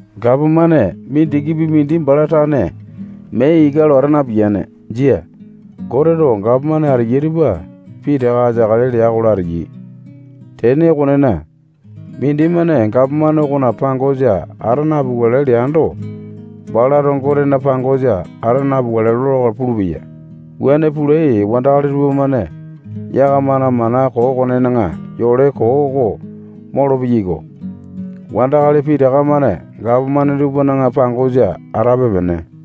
Gapomane mindikipi mindi bala tane mee ika lo ata napiyane. Jia. Goteto gapomane ateyai tupa pitaka ateakale lea-kola, ateyai. Tene okonena, mindimane gapomane okona pangosa ata napukale leando, balato Gotena pangosa ata napukale lola-kola pulupeya. Wuane pulai wandakali tupamane yakamana mana koo okonena yole koo oko molo-peyaiko. Wandakali pitaka-mane gapomane tupana pangosa atape-pene.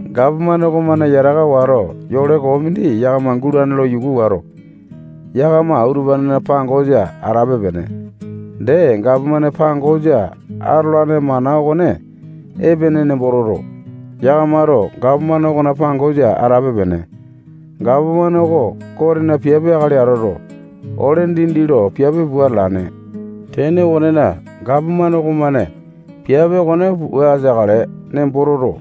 Gapomane okomane yataka wato, yole koo mindi yakama gulane lo yuku wato, yakama utupanena pangosa atape-pene. Dee, gapomane pangosa atolane mana okone epene nembo toto, yakamato gapomane okona pangosa atape-pene. Gapomane oko Gotena piape akali atoto, ole dindi lo piape pua atalane. Tene okonena, gapomane okomane piape okone pua ateakale nembo toto,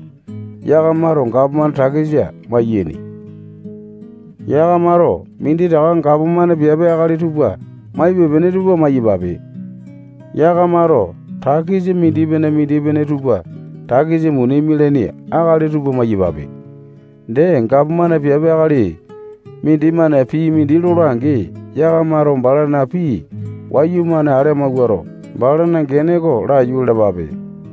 yakamato gapomane takisa maiyaini. Yakamato minditaka gapomane piape akali tupa maipe-pene tupa maiyapape. Yakamato takisa mindipene-mindipene tupa takisa muni mialaini akali tupa maiyapape. Dee, gapomane piape akali mindimane pii mindi lola-angi, yakamato balana pii wayumane ale amauwato, balana gene oko laiyu lalapape.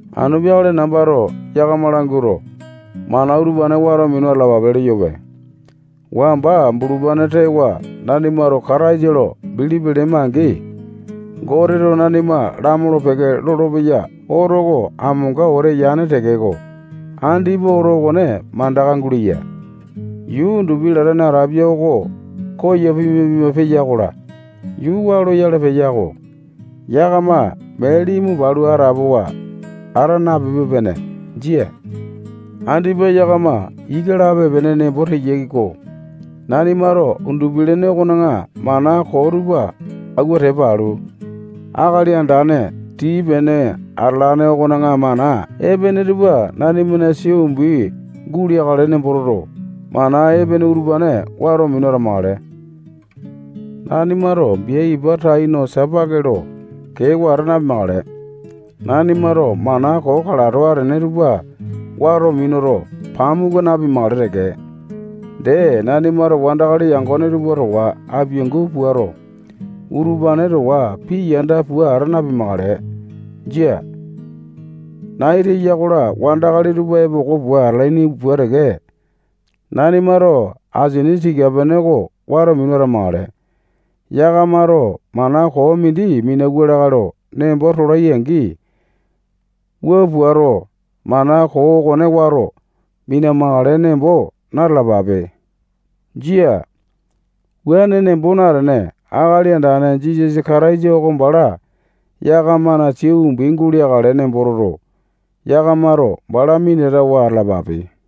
Anu peakale nambato yakama languato, mana utupane wato minu atalapape leyope. Wamba bulupane tewa nanimato Kataisa lo bilipi lema-angi, Goteto nanima lamolo-peke lolopeya oto oko amonga wete yane tekeko, andipa oto okone mandaka guleya. Yuu undupi latane atapia oko koyo pima-pima peya-kola, yuu waa loyale peya-ko. Yakama mee limu palu atapowa ata napepe-pene. Jia. Andipa yakama ika lape-pene nembo teyai-ko. Nanimato undupi-lene okona mana koo tupa auwa tepa alu, Akali Andane tii-pene atalane okona mana epene tupa nanimana sia umbi guleakale nemboto, mana epene utupane wato minu atamakale. Nanimato bia ipa tai no sapake lo kewa ata napimakale. Nanimato mana koo kalato atene tupa wato minuto, pamuku napimakale teke. Dee, nanimato wandakali yangone tupa towa apiangu puato, utupane towa pii yanda pua ata napimakale. Jia. Nai teya-kola, wandakali tupa epoko pua atalaini pua teke, nanimato asini tika-pene oko wato minu atamakale. Yakamato mana koo mindi minauwa lakae lo nembo tolai-angi, wua puato, mana koo okone wato mina-makale nembo na-talapape. Jia. Wuane nembo natene, Akali Andane Jisasa Kataisa oko bala yakamana sia umbi guleakale nembo toto, yakamato bala minatawa atalapape.